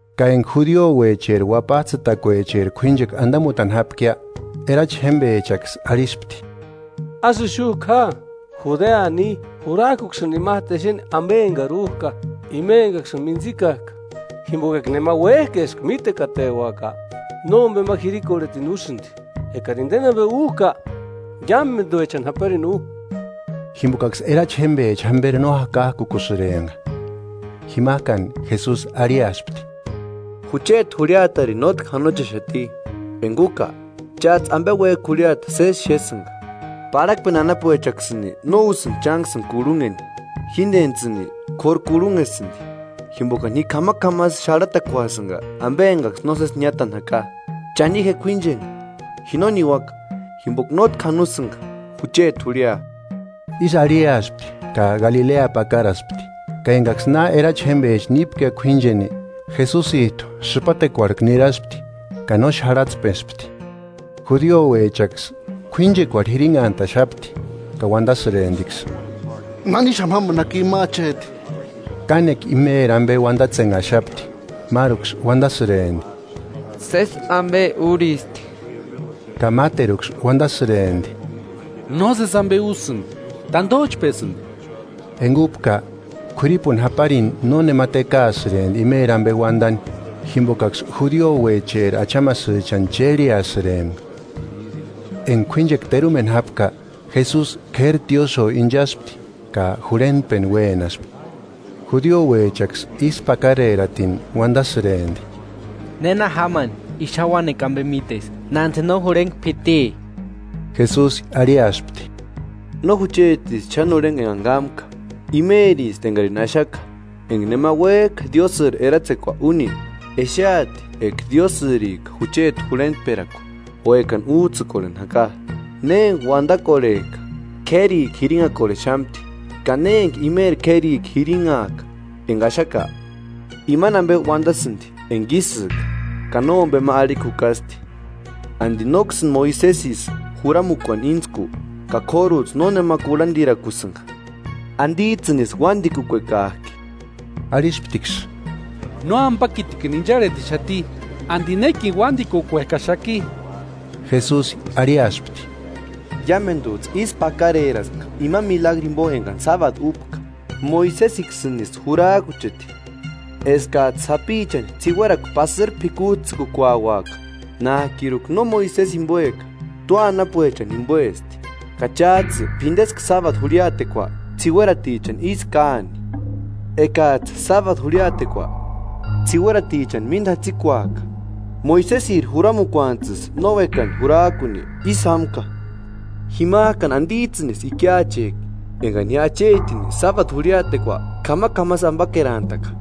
Ka enga judiouecheri Uapajtsïtakuecheri k'uínchekua andamutani jápkia, erachi jémbechaksï arhispti: –Ásï ixujku ja; Judea ni, jurajkuksïni imajtu exeni ambe engari újka, ima engaksïni mintsikajka. Jimboka enga nema uéjka eska mítekateuaka nómbema jirikorhetini úsïndi. Engari indeni ambe újka, iámenduechani japarini u. Jimbokaksï erachi jémbecha jamberi no jakajkukusïrempka Jimajkani Jesusi arhiaspti: –Jucheti jurhiatarini nótki janochexati, enga úka, chájtsï ambe uéjki jurhiata sési xésïnga. Parhakpeni anapuechaksïni no úsïndi chánksïni kurhunheni; jíndentsïni k'óru kurhunhesïndi, jimbokani ji k'amak'amasï xarhatakuasïnga ambe engaksï nósesi niátani jaka. Cha ni je k'uíncheni; ji no niuaka, jimboka nótki janosïnga jucheti jurhia. Ísï arhiaspti ka Galilea pakaraspti. Ka engaksï na erachi jémbecha nípkia k'uínchenia, Jesusijtu sïpatekuarhku niraspti ka no xarhatspespti. Judiouechaksï k'uínchekuarhu jirinhantaxapti, ka uandasïremptiksï: –¿Nanixamu jámani jaki ima acheti? Kánekua imeri ambe uandatsenhaxapti. Máruksï uandasïrempti: “Sési ambe úristi”; ka máteruksï uandasïrempti: “No sési ambe úsïndi; tandojchpesïndi.” Enga úpka, k'uiripuni japarini nónema tekaasïrempti imeri ambe uandani jimbokaksï judiouecheri achamasïchani chérheasïrempka. Enga k'uínchekua terumeni jápka, Jesusi k'éri tiósïo inchaspti ka jurhentpeni uénaspti. Judiouechaksï ísku pakareratini uandasïrempti: –¿Néna jámani i xáni uáni ambe míteski, nándi no jurhengua p'iti? Jesusi arhiaspti: –No juchetisti xáni jurhengua engani kámka, imeristi engarini axaka. Enga nema uéjka Diósïri eratsekua úni, exeati eka Diósïrika jucheti jurhentperakua o ekani újtsïkorheni jaka. Ne enga uandakorhejka, k'érikua jirinhakorhexamti; ka ne enga imeri k'érikua jirinhajka enga axaka, imani ambe uandasïndi enga ísïka, ka nómbema arhikua jukasti. “¿Andi nóksïni Moisesisï juramukuani íntsku? Ka k'órujtsï nónema kurhandirakusïnga. ¿Andijtsïnisï uandikukuekajki?” Arhisptiksï: –¡Nóambakitikini incharhetixati! ¿Andi nékini uandikukuekaxaki? Jesusi arhiaspti: –Iamendujtsï ísku pakareraspka ima milagruni jimbo engani [sábadu] úpka. Moisesiksïnisï jurajkucheti eskajtsï sapichani ts'iuekuarhu pasïri p'ikujtsïkukuauaka, (nájkiruka no Moisesi jimboeka, tua anapuechani jimboesti) ka chájtsï p'indeska sábadu jurhiatekua ts'iueratichani ísï káani. Ekajtsï sábadu jurhiatekua ts'iueritichani mínda jatsikuajka, Moisesiri juramukuanijtsïsï no uékani jurajkuni ísï jámka, ¿Jimajkani andijtsïnisï ikiachejki engani ji achetini sábadu jurhiatekua k'amak'amasï ambakerantaka?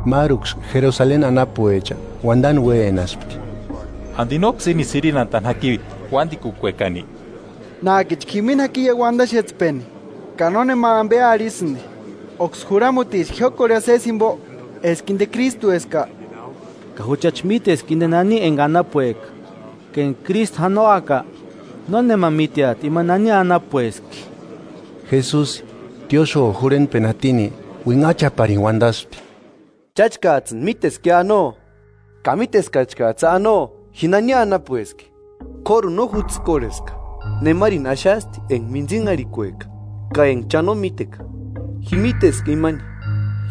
Máruksï Jerusaleni anapuecha uandani uénaspti: –¿Andi nóksï ínisï jirinhantani jaki uándikukuekani? Nájkichka jimini jakiia uadaxetspeni ka nónema ambe arhisïndi. ¿Óksï juramuticha jiókorhia sési jimbo eska inde Krístueska? Ka juchachi míteska inde nani enga anapueka; ka eka Krístu janoaka, nónema míteati ima nani anapueski. Jesusi, tiósïo jurhentpeni jatini, uinhachaparini uandasti: –¡Cháchkajtsïni míteskia anoo! ¡Ka míteskachkajtsïa anoo ji nani anapueski! K'óruni no jutsïkorheska, nemarini axasti enga mintsinharhikueka ka enga cha no míteka. Ji míteska imani,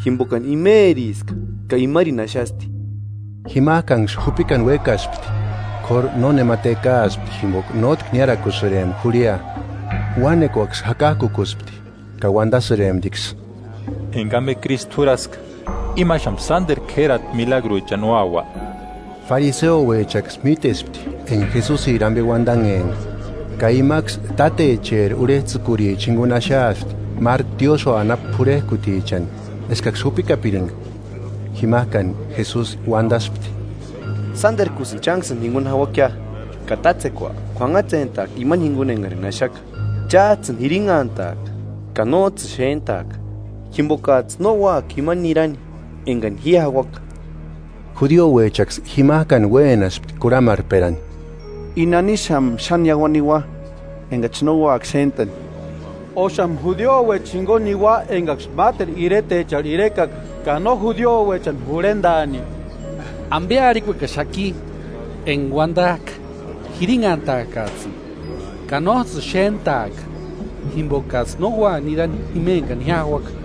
jimbokani imeriska ka imarini axasti. Jimajkanksï jupikani uékaspti, k'óru nónema tekaaspti, jimboka nótki niárakusïrempka jurhia. Uánekuaksï jakajkukuspti, ka uandasïremptiksï: –Enga ambe Krístu jurhaska ¿Imaxamu sánderu k'érati milagruechani úaua? Fariseuechaksï mítespti enga Jesusiri ambe uandanhempka; ka imaksï tátecheri urhejtsïkuricha jinguni axaaspti máru tiósïo anapu p'urhejkutichani eskaksï jupikapiringa. Jimajkani Jesusi uandaspti: –Sánderkusïni chánksïni jinguni jauakia, ka tátsekua k'uanhatsentaaka imani jinguni engarini axaka. Chájtsïni jirinhantaaka, ka nójtsïni xéntaaka, jimbokajtsï no úaka jima nirani engani ji jauaka. Judiouechaksï jimajkani uénaspti kurhamarhperani: –¿I nanixamu xáni iauani niua, engachi no úaka xéntani? ¿Óxamu judiouecha jinguni niua engaksï máteru iretecharhu irekaka ka no judiouechani jurhendaani? ¿Ambe arhikuekaxaki enga uandajka: Jirinhantaakajtsïni, ka nójtsïni xéntaaka, jimbokajtsï no úaka nirani jima engani ji jauaka?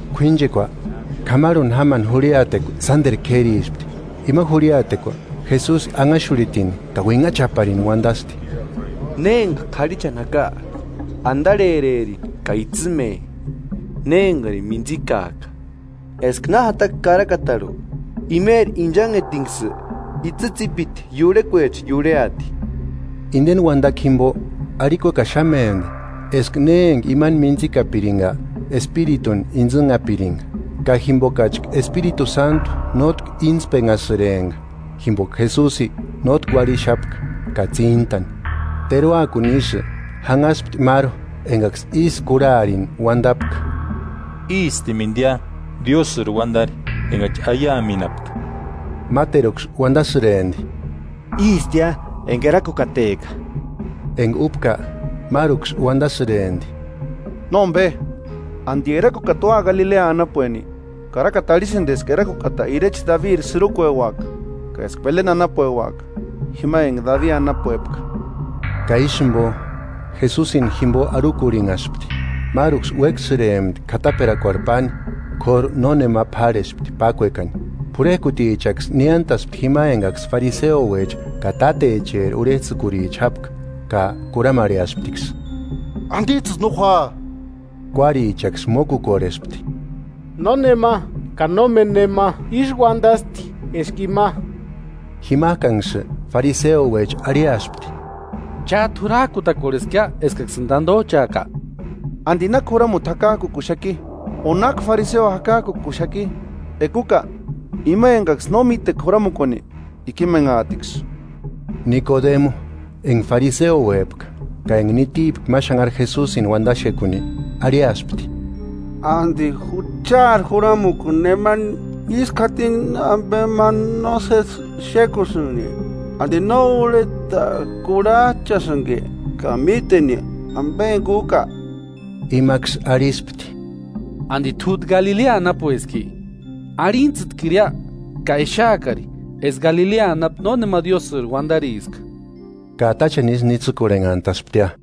K'uínchekua k'amarhuni jámani jurhiatekua sánderu k'érispti. Ima jurhiatekua Jesusi anhaxurhitini ka uinhachaparini uandasti: –Ne emanga k'arhichani jaka, andarhererini ka itsïme, ne engarini mintsikajka. Eska na jataka Karakatarhu: Imeri inchanhetinksï itsï tsípiti iurhekuecha iurheati. Indeni uandakua jimbo, arhikuekaxamempti eska ne enga imani mintsïkapiringa Espirituni intsïnhapiringa; ka jimbokachka Espiritu Sántu nótki íntspenhasïrempka, jimboka Jesusi nótki uarhixapka ka tsíntani. Teruakuni isï janhaspti máru engaksï ísï kurharini uandapka: –Ístimendiata Diósïri Uandari engachi aiamenhapka. Máteruksï uandasïrempti: –Ístia enga Erakukateka. Enga úpka, máruksï uandasïrempti: –Nómbe, ¿Andi Erakukata ua Galilea anapueni? Karakata arhisïndi eska Erakukata irecha Dabiri sïrukueuaka, ka eska Beleni anapueuaka, jima enga Dabi anapuepka. Ka ísï jimbo, Jesusini jimbo arhukurhinhaspti. Máruksï uéksïrempti k'ataperakuarhu páni, k'óru nónema p'árhespti pákuekani. P'urhejkutichaksï niántaspti jima engaksï fariseuecha ka tátecheri urhejtsïkuricha jápka, ka kurhamarheasptiksï: –¿Andijtsïsï no jua? Kuárichaksï mókukorhespti: –¡Nónema, ka nómeni nema ísï uandasti eska ima! Jimajkanksï fariseouecha arhiaspti: –¿Chájtu jurajkutakorheskia eskaksïni tandojchaaka? ¿Andi náki juramuti jakajkukuxaki, o náki fariseo jakajkukuxaki? Eka úka, ima engaksï no míteka juramukuani, ikimenhaatiksï. Nikodemu, enga fariseuepka ka enga nitipka ma xanhari Jesusini uandaxekuni arhiaspti: 51–¿Andi juchaari Juramukua nemani ísku jatini ambe ma nósesi xékusïnki? ¿Andi no urheta kurhajchasïnki ka míteni ambe enga úka? Imaksï arhispti: –¿Andi t'újtu Galilea anapueski? Arhintsïtkiria, ka exeakari eska Galilea anapu nónema Diósïri uandariska. Ka táchani isï nitsïkorhenhantasptia.